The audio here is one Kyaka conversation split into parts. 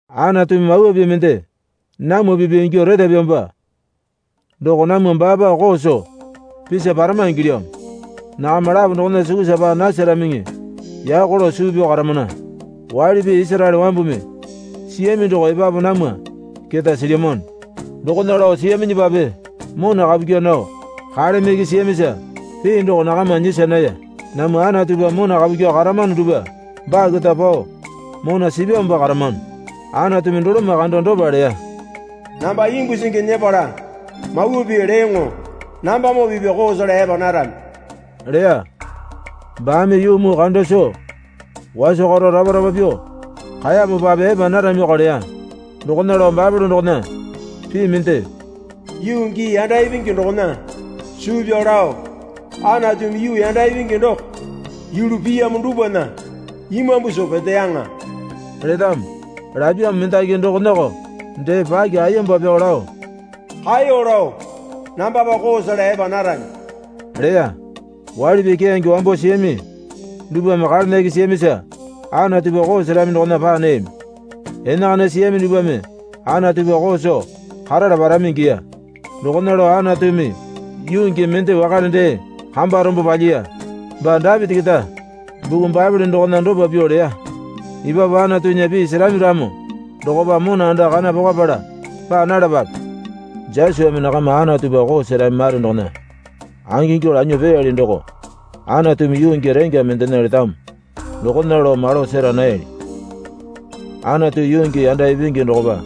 Anatumi mawa pii mende namwa pipya ingyuo retapyamopa doko namwa baapa koo soo pisa parama ingilyamo. Nakama lapo dokona sukusa paa nasaramiŋi yako lao suu pyao karamana. Waili pii Isaraele wambumi siyami doko epapu namwa keta silyamano. Dokona lao siyaminyipape mona kapu kyaa nao kaleme iki siyamisa pii doko nakama nyisa naya. Namwa Anatupa mona kapu kyuo karamano dupwa baa keta pao mona sipyamopa karamano. Anatumi doloma kando dopa leya. Namba imbu singi nyepala mawa pii leyoŋo nambamoo pipya koo sela epa narami, leya. Baame yuu muu kanda soo waso karo rapa rapa pyuo kaeyamopape epa naramioko leya. Dokona lao Baepole dokona pii mende, Yuu gii yanda ipingi dokona suu pyao lao Anatumi yuu yanda ipingi doko yulu piyamo dupwana imambu soo peteyaŋa letamo. Lapyamo mendaki dokonako dee paki ayemba pyao lao kaeyo lao nambapa koo sela epa narami leya. Waili pii keyange wambo siyami dupwame kalena iki siyamisa Anatupa koo serami dokona paa nayami. Enakana siyami dupwame Anatupa koo soo karala parami ingiya. Dokona lao Anatumi yuu gii mende wakale dee kamba rombo palyiya. Baa Dapiti keta buku Baepole dokona dopa pyuo leya. Epapu Anatunya pii serami ramo dokopa mona anda kana pokapala paa nalapape. Josuame nakama Anatupa koo serami mare dokona angingyuo lanyuo peyali doko Anatumi yuu gii rengya mendena letamo dokona lao malo sera nayali. Anatu yuu gii yanda ipingi dokopa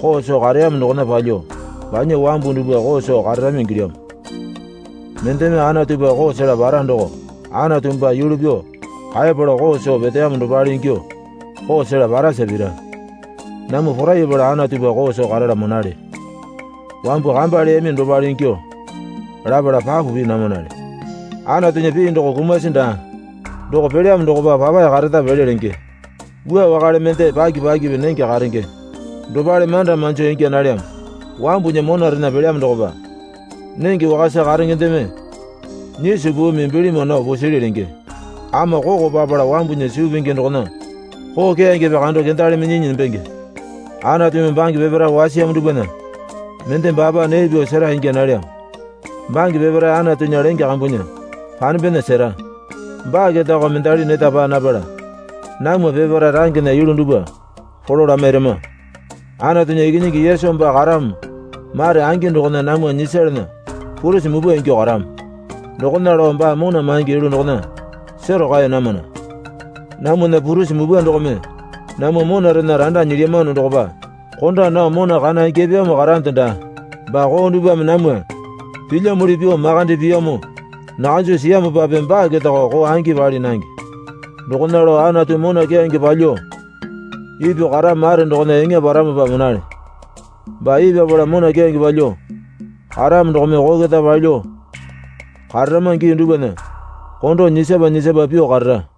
koo soo kareyamo dokona palyuo banya wambu dupwa koo soo kararami ingilyamo. Mendeme Anatupa koo sela para doko Anatu baa yulu pyuo kaepala koo soo peteyamo dopale ingyuo koo sela parasa pira. Namwa porayapala Anatupa koo soo karala monale. Wambu kamba leyami dopale ingyuo lapala papu pii namanale. Anatunya pii doko kumasi daa. Doko pelyamo dokopa papae kareta pele lenge. Wua wakale mende paki pakipi nenge karenge dopale manda manjo ingya nalyamo. Wambunya monarena pelyamo dokopa nenge wakasa karengendeme nyiso puumi bilima nao pusili lenge. Ama koko papala wambunya suu pingi dokona koo keyangepe kando kendali minyinyi nembenge. Anatumi bange peparae wasiyamo dupwana mende baapa nee pyuo sera ingya nalyamo. Bange peparae Anatunya lenge kambunya panembena sera. Baa ketako mendali neta paa napala namwa peparae rangena yulu dupwa polo lamairama. Anatunya Ikinyingi Yesu baa karamo mare angi dokona namwa nyisalana purisi mupwa ingyuo karamo. Dokona lao baa mona maingi yulu dokona sero kaeya namana. Namwana purisi mupwa dokome namwa monarena randa nyilyamano dokopa konda nao mona kana ingyapyamo karande daa. Baa koo dupwame namwa pilyamuli pyuo makande piyamo nakanjo siyamopape baa ketako koo angi pali nange. Dokona lao Anatu mona keyange palyuo ipyuo karamo mare dokona eŋa paramopa monale. Baa ipyapala mona keyange palyuo karamo dokome koo keta palyuo kararama gii dupwana kondo nyisapa nyisapa pyuo karara.